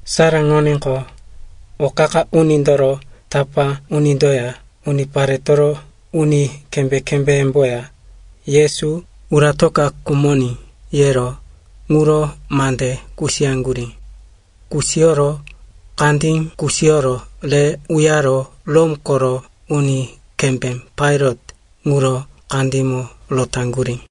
Saraŋoníqo, o qa-qa unindoro tapá unindoya uniparetoro uni kembé-kembéyemboya, Yesu uratoka khumoní, yero ŋuro mande kusiyaŋgurí. Kusiyoro kandí kusiyoro re uyaro Rom koro uni kembé Pailat ŋuro kandímo rotaŋgurí.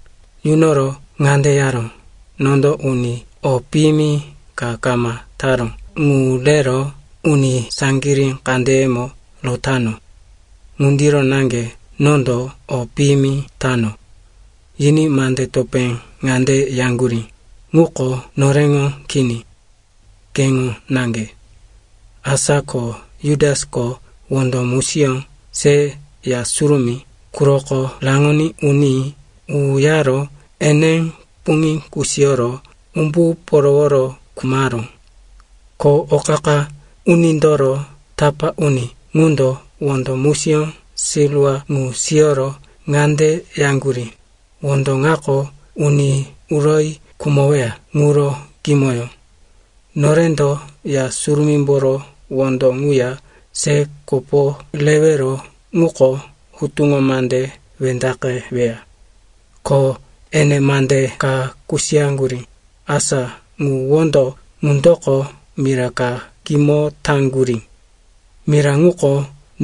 Yunoro ŋande yaró, “Nondo uni o piyimi ka kama taró ŋu rero uni saŋgirí kandeyemo rotano. Ŋundiro naŋge nondo o piyimi tano.” Yiní mandí topé ŋande yaŋgurí, “Ŋuko noreŋo kini. Keŋo naŋge.” Asa ko Jutasko wondo musiyó se Ya Surumí quroko raŋoní uní uyaro ene puŋí kusiyoro umbu poroworo khumaró. Ko o qa-qa unindoro tapá uni ŋundo wondo musiyó silwa ŋu siyoro ŋande yaŋgurí, “Wondo ŋako uni uroyi khumoweya ŋuro kimoyó. Norendo Ya Surumímboro wondo ŋuya se kopo rewero ŋuko hutuŋo mande wendaqeweya.” Ko ene mande ka kusiyaŋgurí, asa ŋu wondo ŋundoko mira ka kimo taŋgurí. Mira ŋuko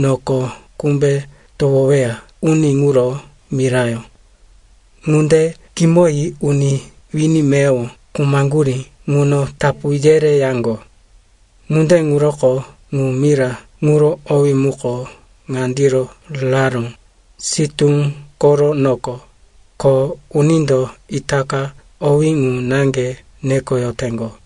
noko kumbe towoyoweya uni ŋuro mirayó. Ŋunde kimoyi uni wini meyowo khumaŋgurí ŋuno tapu yereyaŋgo. Ŋunde ŋuroko ŋu mira ŋuro owí muko ŋandiro raró, “Sitú koro Noko,” ko unindo itaka owé ŋu naŋge nekoyoteŋgo.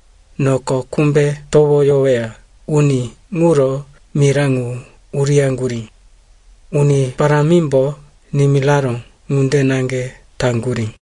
noko kumbe towoyoweya uni ŋuro mira ŋu uriyaŋgurí. Uni Parámimbo nimiraró ŋunde naŋge taŋgurí.”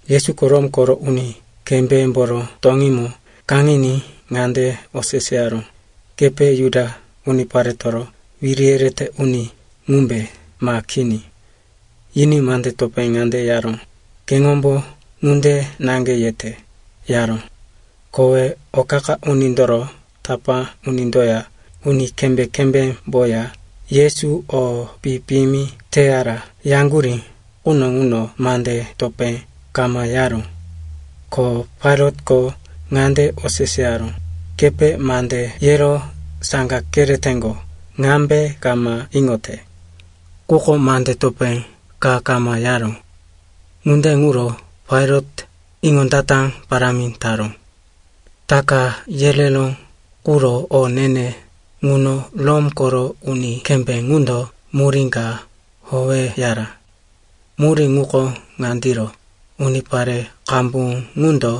Yesuko Rom koro uni kembémboro toŋímo kaŋiní ŋande oseseyaró, “Kepe Juda uniparetoro wiri yerete uni ŋumbe, ma kini?” Yiní mande topé ŋande yaró, “Keŋombo ŋunde naŋge yete,” yaró. Kowe o qa-qa unindoro tapá unindoya uni kembé-kembémboya Yesu o pi-piyimi teyara yaŋgurí quno ŋuno mande topé kama yaró. Ko Pailatko ŋande oseseyaró, “Kepe mande yero saŋga kereteŋgo ŋambe kama iŋote?” Quko mande topé ka kama yaró. Ŋunde ŋuro Pailat iŋondata parámi taró. Taka yereró quro o ne-ne ŋuno Rom koro uni kembé ŋundo murí ka howeyara. Murí ŋuko ŋandiro, unipare qambu ŋundo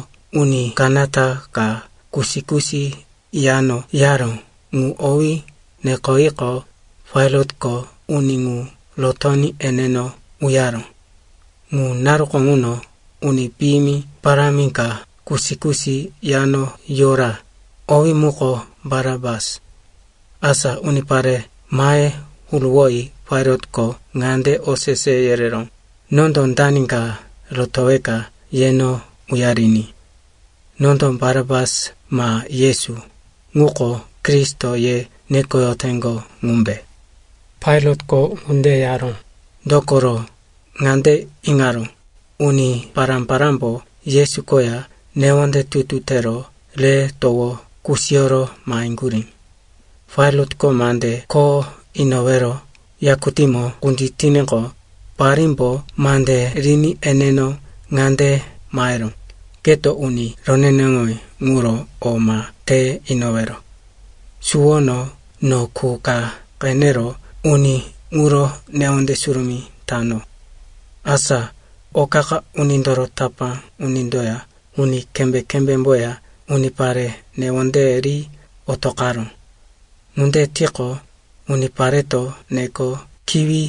uni kanata ka kusi-kusi yano yaró ŋu owí nekoyiqo, Pailatko uni ŋu rotoní eneno uyaró. Ŋu naruko ŋuno uni piyimi parámi ka kusi-kusi yano yora, owí muko Barapas. Asa unipare mahe huruwoyi Pailatko ŋande osese yereró, “Nondo dani ka rotoweka yeno uyariní? Nondo Barapas ma Yesu, ŋuko, Kristo, ye nekoyoteŋgo ŋumbe?” Pailatko ŋunde yaró, dokoro ŋande iŋaró, uni pará-parámbo Yesu koya newonde tutu tero re towo kusiyoro maheŋgurí. Pailatko mande kho inowero yakutímo kunditiníqo, parímbo mande riní eneno ŋande maheró, “Keto uni roneneŋowí ŋuro o ma te inowero. Suwono no qu ka qenero uni ŋuro newonde surumí tano.” Asa o qa-qa unindoro tapá unindoya uni kembé-kembémboya unipare newondeye ri otoqaró. Ŋunde tiqo, unipareto neko kiwi,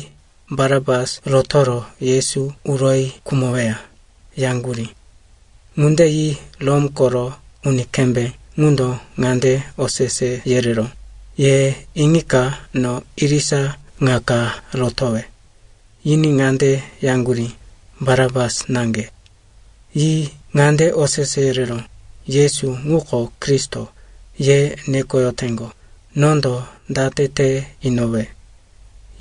Barapas rotoro Yesu uroyi khumoweya, yaŋgurí. Ŋunde yi Rom koro uni kembé ŋundo ŋande osese yereró, “Ye iŋika no irisa ŋa ka rotowe?” Yiní ŋande yaŋgurí, “Barapas naŋge.” Yi ŋande osese yereró, “Yesu, ŋuko, Kristo, ye nekoyoteŋgo, nondo date te inowe?”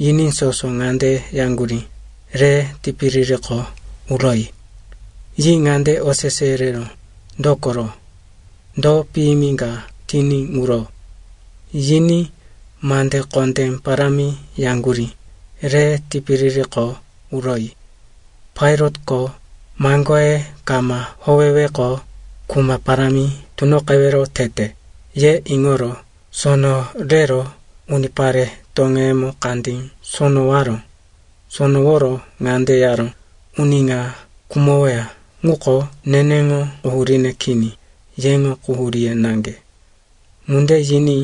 Yiní soso ŋande yaŋgurí, “Re tipiririko uroyi!” Yi ŋande osese yereró, “Dokoro? Do piyimi ka tiní ŋuro?” Yiní mande kondé parámi yaŋgurí, “Re tipiririko uroyi!” Pailatko, maŋgoye kama howeweqo, kuma parámi tunoqewero tete, ye iŋoro sono rero unipare toŋeyemo kandí sonowaró. Sonoworo ŋande yaró, “Uni ŋa khumoweya ŋuko neneŋo quhuríne kini, yeŋo quhuríye naŋge.” Ŋunde yiní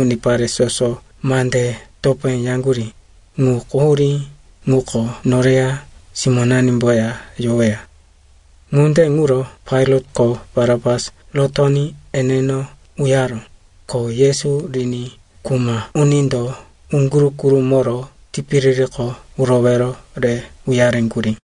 unipare soso mande topé yaŋgurí, “Ŋu quhurí ŋuko noreya simónanimboya yoweya.” Ŋunde ŋuro Pailatko Barapas rotoní eneno uyaró, ko Yesu riní kuma unindo uŋguru-gurumoro tipiririko urowero re uyareŋgurí.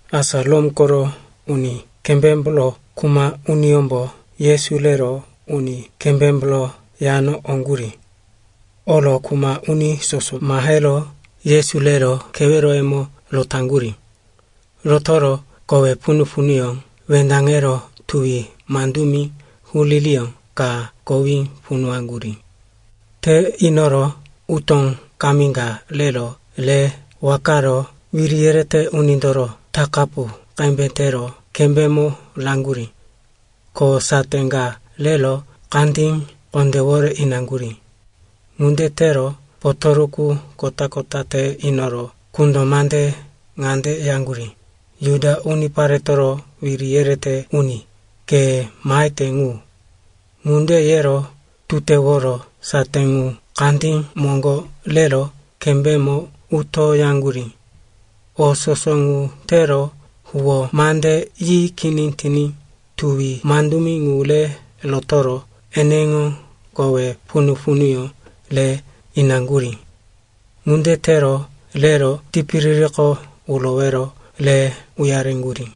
Asa Rom koro uni kembémboro kuma uniyómbo Yesu rero uni kembémboro yano oŋgurí. Oro kuma uni soso mahero Yesu rero keweroyemo rotaŋgurí. Rotoro kowe punu-punuyó wendaŋero tuwi mandumi huririyó ka kowí punuwaŋgurí. Te inoro utó kami ka rero re wakaro wiri yerete unindoro takapu qembe tero kembémo raŋgurí. Ko saté ka rero kandí kondéwore inaŋgurí. Ŋunde tero potoruku kota-kota te inoro kundo mande ŋande yaŋgurí, “Juda uniparetoro wiri yerete uni, ke mahete ŋu!” Ŋunde yero tuteworo saté ŋu kandí moŋgo rero kembémo utoyaŋgurí. O soso ŋu tero huwó mande yi kini tiní tuwi mandumi ŋu re rotoro eneŋo kowe punu-punuyó re inaŋgurí. Ŋunde tero rero tipiririko urowero re uyareŋgurí.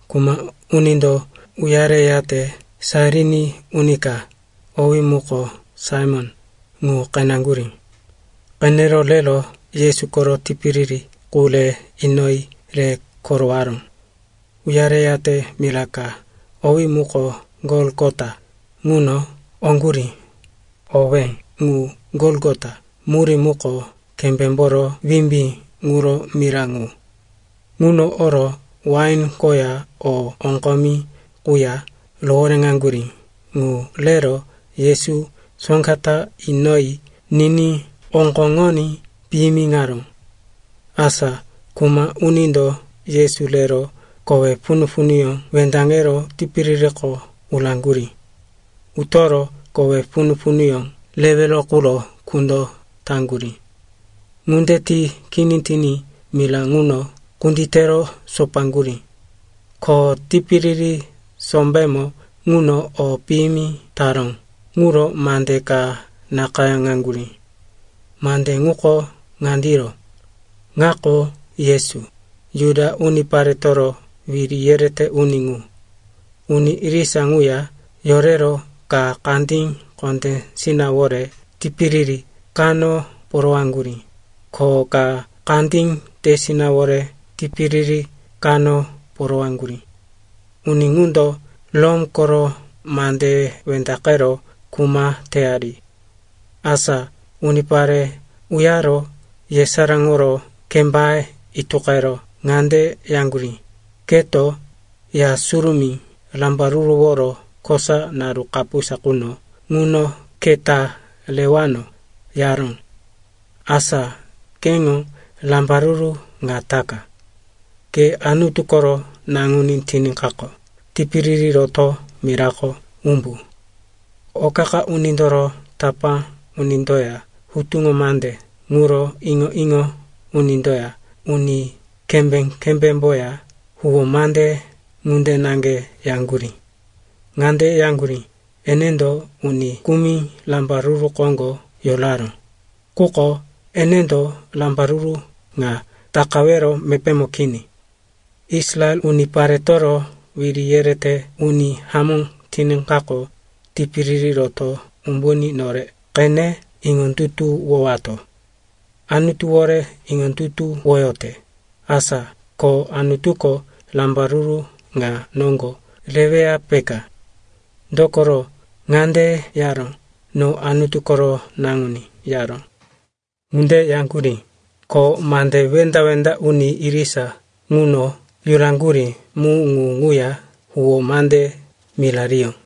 Kuma unindo uyareyate Sairin uni ka, owí muko Saimon, ŋu qeneŋgurí. Qenero rero Yesu koro tipiriri qu re inoyi re korowaró. Uyareyate mira ka, owí muko Golgota, ŋuno oŋgurí. (Owé ŋu “Golgota” murí muko “Kembémboro Wimbí ŋuro mira ŋu.”) Ŋuno oro wain koya o oŋgomi quya rohoréŋaŋgurí ŋu rero Yesu soŋga ta inoyi niní oŋgoŋoní piyimiŋaró. Asa kuma unindo Yesu rero kowe punu-punuyó wendaŋero tipiririko uraŋgurí. Utoro kowe punu-punuyó rewero quro kundo taŋgurí. Ŋunde ti kini tiní mira ŋuno kunditero sopaŋgurí. Ko tipiriri sombémo ŋuno o piyimi taró ŋuro mande ka nakayáŋaŋgurí. Mande ŋuko ŋandiro: “Ŋako Yesu, Juda uniparetoro Wiri yerete Uni ŋu.” Uni irisa ŋuya yorero ka kandí kondésinawore tipiriri kano porowaŋgurí, ko ka kandí tesinawore tipiriri kano porowaŋgurí. Uni ŋundo Rom koro mandeye wendaqero kuma teyari. Asa unipare uyaro yesaráŋoro kembaye ituqero ŋande yaŋgurí, “Keto, Ya Surumí rambaruruworo kosa naru kapusa quno ŋuno keta rewano, yaró. Asa keŋo rambaruru ŋa taka. Ke Anutu koro naŋuní tiníkaqo, tipiriri roto mirako umbu!” O qa-qa unindoro tapá unindoya hutuŋo mande ŋuro iŋo-iŋo unindoya uni kembé-kembémboya huwó mande ŋunde naŋge yaŋgurí. Ŋande yaŋgurí, “Enendo uni kumi rambaruru koŋgo yoraró, quko enendo rambaruru ŋa takawero mepémo kini. Israel uniparetoro wiri yerete uni hamó tiníkaqo, tipiriri roto umbuní nore qene iŋondutuwowato. Anutuwore iŋondutuwoyote, asa ko Anutuko rambaruru ŋa noŋgo reweya, peka. Dokoro ŋande yaró, ‘No Anutu koro naŋuní,’ yaró.” Ŋunde yaŋgurí, ko mande wenda-wenda uni irisa ŋuno yuraŋgurí mu ŋu ŋuya huwó mande mirariyó.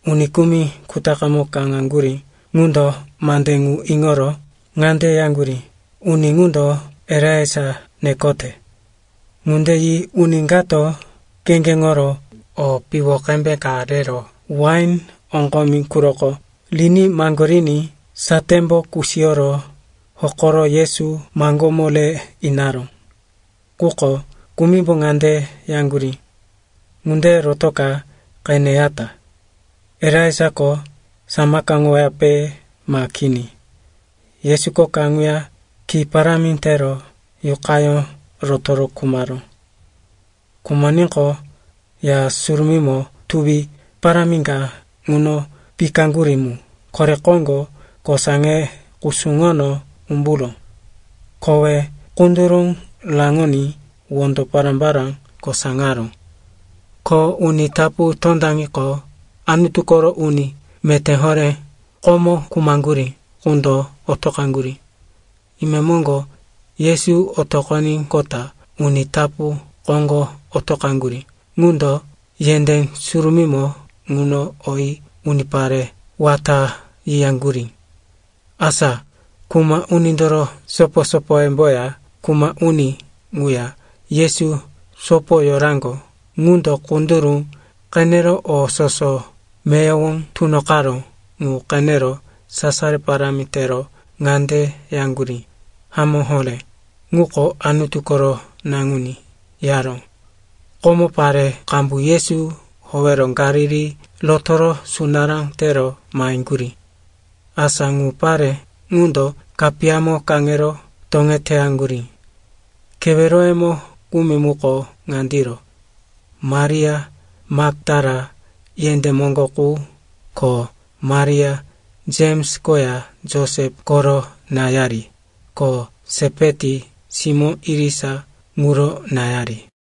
Uni kumi kutaqe kaŋaŋgurí ŋundo mande ŋu iŋoro ŋande yaŋgurí, “Uni ŋundo Elaija nekote.” Ŋunde yi uni kato kheŋgeŋoro o piwo qembe ka rero wain oŋgomi quroko riní maŋgoriní satémbo kusiyoro hokoro Yesu maŋgómo re inaró. Quko kumimbo ŋande yaŋgurí, “Ŋunde rotoka, qeneyata. Elaijako samakaŋoweyape ma kini?” Yesuko kaŋuya ki parámi tero yuqayó rotoro khumaró. Khumoníqo, Ya Surumímo tuwi parámi ka ŋuno pikaŋgurí mu kore koŋgo kosaŋe kusuŋono umburó. Kowe kunduru raŋoní wondo pará-pará kosaŋaró. Ko uni tapu tondaŋiqo, Anutu koro uni meté horé komo khumaŋgurí qundo otoqaŋgurí. Imemoŋgo, Yesu otoqoníqota uni tapu koŋgo otoqaŋgurí ŋundo yendé surumímo ŋuno oyi unipare wata yiyaŋgurí. Asa kuma unindoro sopo-sopoyemboya kuma uni ŋuya Yesu sopo yoraŋgo ŋundo kunduru qenero o soso meyowo tunoqaró ŋu qenero sasaro parámi tero ŋande yaŋgurí, “Hamó horé, ŋuko Anutu koro naŋuní,” yaró. Komo pare qambu Yesu howero Galili rotoro sunará tero maheŋgurí. Asa ŋu pare ŋundo kapiyamo kaŋero toŋeteyaŋgurí. Keweroyemo kumi muko ŋandiro: Maria Maktala yendé moŋgo qu, ko Maria, Jems koya Josep koro náyari, ko Sepeti simó irisa ŋuro náyari.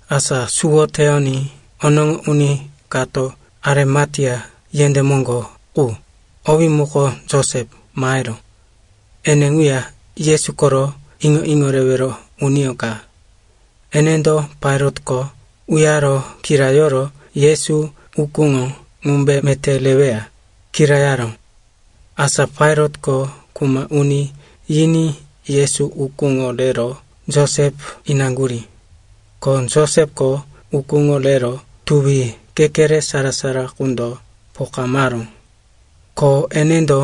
Asa suwo teyoní onoŋo uni kato Arimatea yendé moŋgo qu, owí muko Josep, maheró. Ene ŋuya Yesu koro iŋo-iŋo rewero uniyó ka. Enendo Pailatko uyaro kirayoro Yesu ukúŋo ŋumbe meté reweya, kirayaró. Asa Pailatko kuma uni yiní Yesu ukúŋo rero Josep inaŋgurí. Ko Josepko ukúŋo rero tuwi kekere sara-sara qundo pokamaró. Ko enendo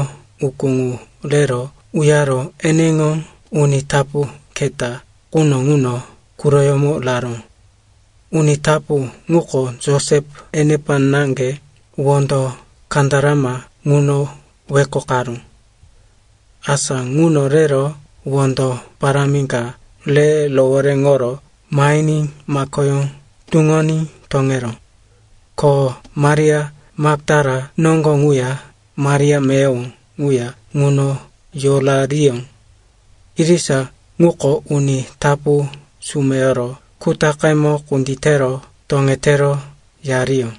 ukú ŋu rero uyaro eneŋo uni tapu keta quno ŋuno quroyómo raró. Uni tapu ŋuko Josep enepa naŋge wondo kandarama ŋuno wekokaró. Asa ŋuno rero wondo parámi ka re rohoréŋoro mahiní makoyó tuŋoní toŋeró. Ko Maria Maktala noŋgo ŋuya Maria meyowo ŋuya ŋuno yorariyó. Irisa ŋuko uni tapu sumeyoro kutaqemo kunditero toŋetero yariyó.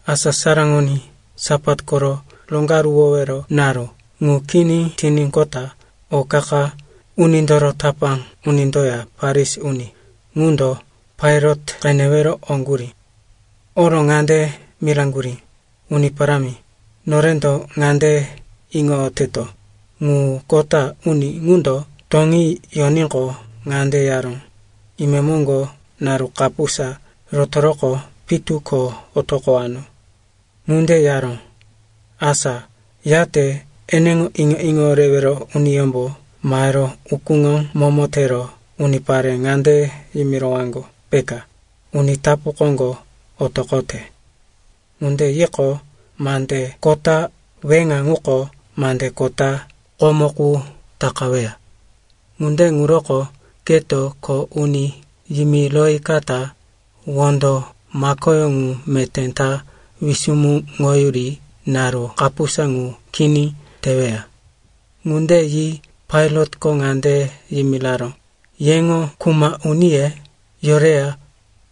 Asa saraŋoní, Sapat koro roŋgaruwowero naru ŋu kini tiníqota o qa-qa unindoro tapá unindoya Farisi uni ŋundo Pailat qenewero oŋgurí. Oro ŋande miraŋgurí, “Uni Parámi, norendo ŋande iŋoyoteto, ŋu kota uni ŋundo toŋí yoníqo, ŋande yaró, ‘Imemoŋgo naru kapusa rotoroqo, pitu ko otoqowano.’ Ŋunde yaró, asa yate eneŋo iŋo-iŋo rewero uniyómbo mahero ukúŋo momo tero unipare ŋande yimirowaŋgo, peka, uni tapu koŋgo otoqote. Ŋunde yiqo, mande kota weŋa ŋuko mande kota komo qu takaweya. Ŋunde ŋuroko keto kho uni yimiroyikata, wondo makoyó ŋu meté ta wisumuŋoyuri naru kapusa ŋu kini teweya.” Ŋunde yi Pailatko ŋande yimiraró, “Yeŋo kuma uniye yoreya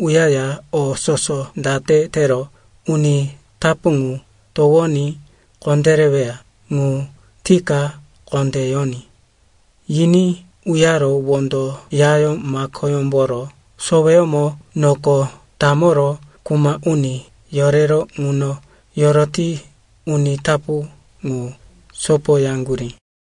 uyaya o soso date tero uni tapu ŋu towoní kondéreweya ŋu tika kondé yoní.” Yiní uyaro wondo yayó makoyómboro soweyómo noko tamoro kuma uni yorero ŋuno yoroti uni tapu ŋu sopoyaŋgurí.